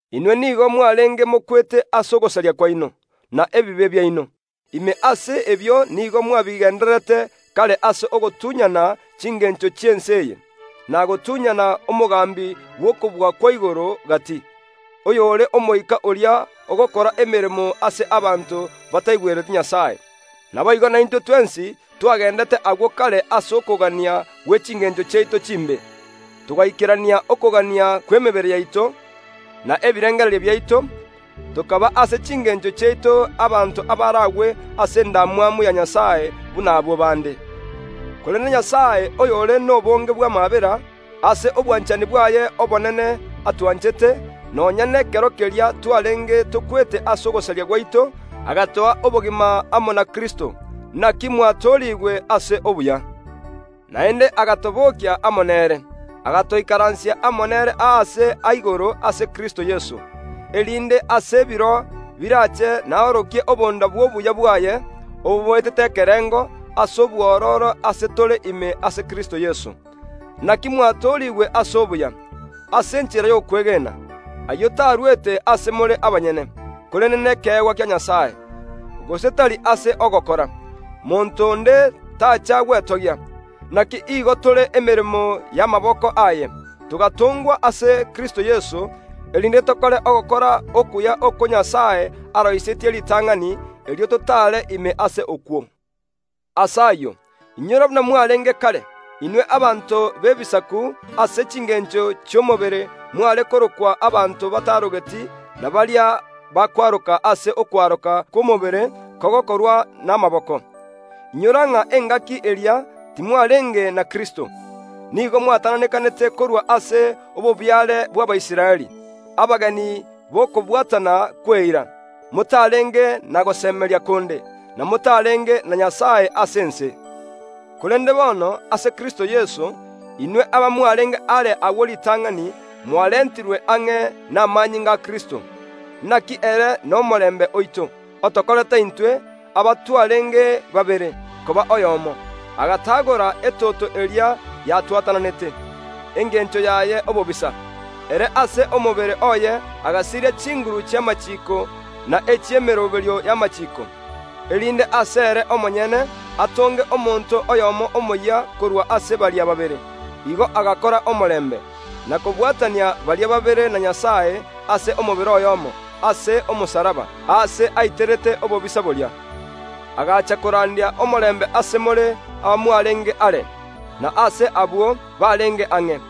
Inwe nigo mwareenge mokwete ase ogosaria kwaino, na ebibe biaino. Ime ase ebio nigo mwabigendererete kare ase ogotunyana chingeencho chi’ense eye, na gotunyana omogambi bw’okobua kwa igoro gati, oyore omoika oria ogokora emeremo ase abanto bataigwereti Nyasae. Naboigo naintwe twensi twagendete agwo kare ase okogania gwe chingeencho chiaito chimbe, togaikerania okogania kw’emebere yaito, na ebirengererio biaito, tokaba ase chingeencho chiaito; abanto abaragwe ase endamwamu ya Nyasae buna abwo bande. Korende Nyasae, oyore n’obonge bw’amaabera, ase obwanchani bwaye obonene atwanchete, nonya n’ekero keria twareenge tokwete ase ogosaria gwaito, agatoa obogima amo na Kristo; inaki mwatoorigwe ase obuya bwa Nyasae. Naende agatobookia amo nere, agatoikaransia amo nere aaria igoro ase Kristo Yeso, erinde ase ebiro biraache naorokie obonda bw’obuya bwaye, obo boetete ekerengo, ase obwororo ase tore ime ase Kristo Yeso. Inaki mwatoorigwe ase obuya, ase enchera y’okwegena; ayio tarwete ase more abanyene, korende nekeegwa kia Nyasae; gose tari ase ogokora, monto onde taacha gwetogia. Inaki nigo tore emeremo y’amaboko aye, togatongwa ase Kristo Yeso, erinde tokore ogokora okuya okwo Nyasae aroisetie ritang’ani, erio totaare ime ase okwo. Ase ayio, inyora buna mwareenge kare. Inwe abanto b’Ebisaku ase chingeencho chi’omobere mware korokwa abanto batarogeti na baria bakwaroka ase okwaroka kw’omobere kogokorwa n’amaboko. Inyora ng’a engaki eria timwareenge na Kristo, nigo mwatananekanete korwa ase obobiare bw’Abaisraeli, abageni b’okobwatana kw’eira, motareenge na gosemeria konde, na motareenge na gosemeria na Nyasae ase ense. Korende bono, ase Kristo Yeso, inwe abamwareenge are agwo ritang’ani, mwarentirwe ang’e n’amanyinga a Kristo. Inaki Kristo nomorembe oito, otokorete intwe, Abayahudi n’Abagiliki, koba oyomo, goetera ase omobere oye agatagora etoto eria yatwatananete, engencho yaye obobisa. Ere agasiria richiiko ri’Abayahudi n’emeroberio y’amachiiko, erinde ase ere omonyene atonge omonto oyomo omoyia korwa ase baria babere, igo agakora omorembe, na kobwatania baria babere na Nyasae ase omobere oyoomo, ase omosalaba, aase aiterete obobisa boria. Kristo agacha korandia omorembe ase abanto b’ebisaku abwo mwareenge are, na ase Abayahudi abwo bareenge ang’e.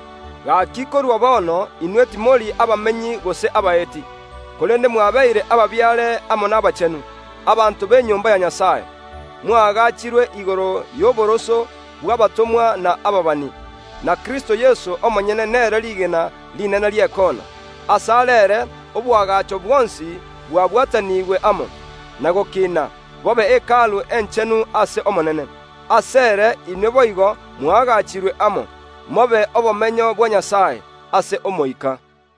Gaki korwa bono inwe abanto b’ebisaku timori abamenyi gose abaeti, korende mwabeire ababiare amo n’abachenu, abanto b’enyomba ya Nyasae, mwagaachirwe igoro y’oboroso bw’abatomwa na ababani, na Kristo Yeso omonyene nere rigena rinene ri’ekoona. Ase are ere oboagacho bwonsi bwabwataniigwe amo, na gokiina, bobe Hekalu Enchenu ase Omonene. Asere inwe boigo mw’agaachirwe amo, mobe obomenyo bwa Nyasae, ase Omoika.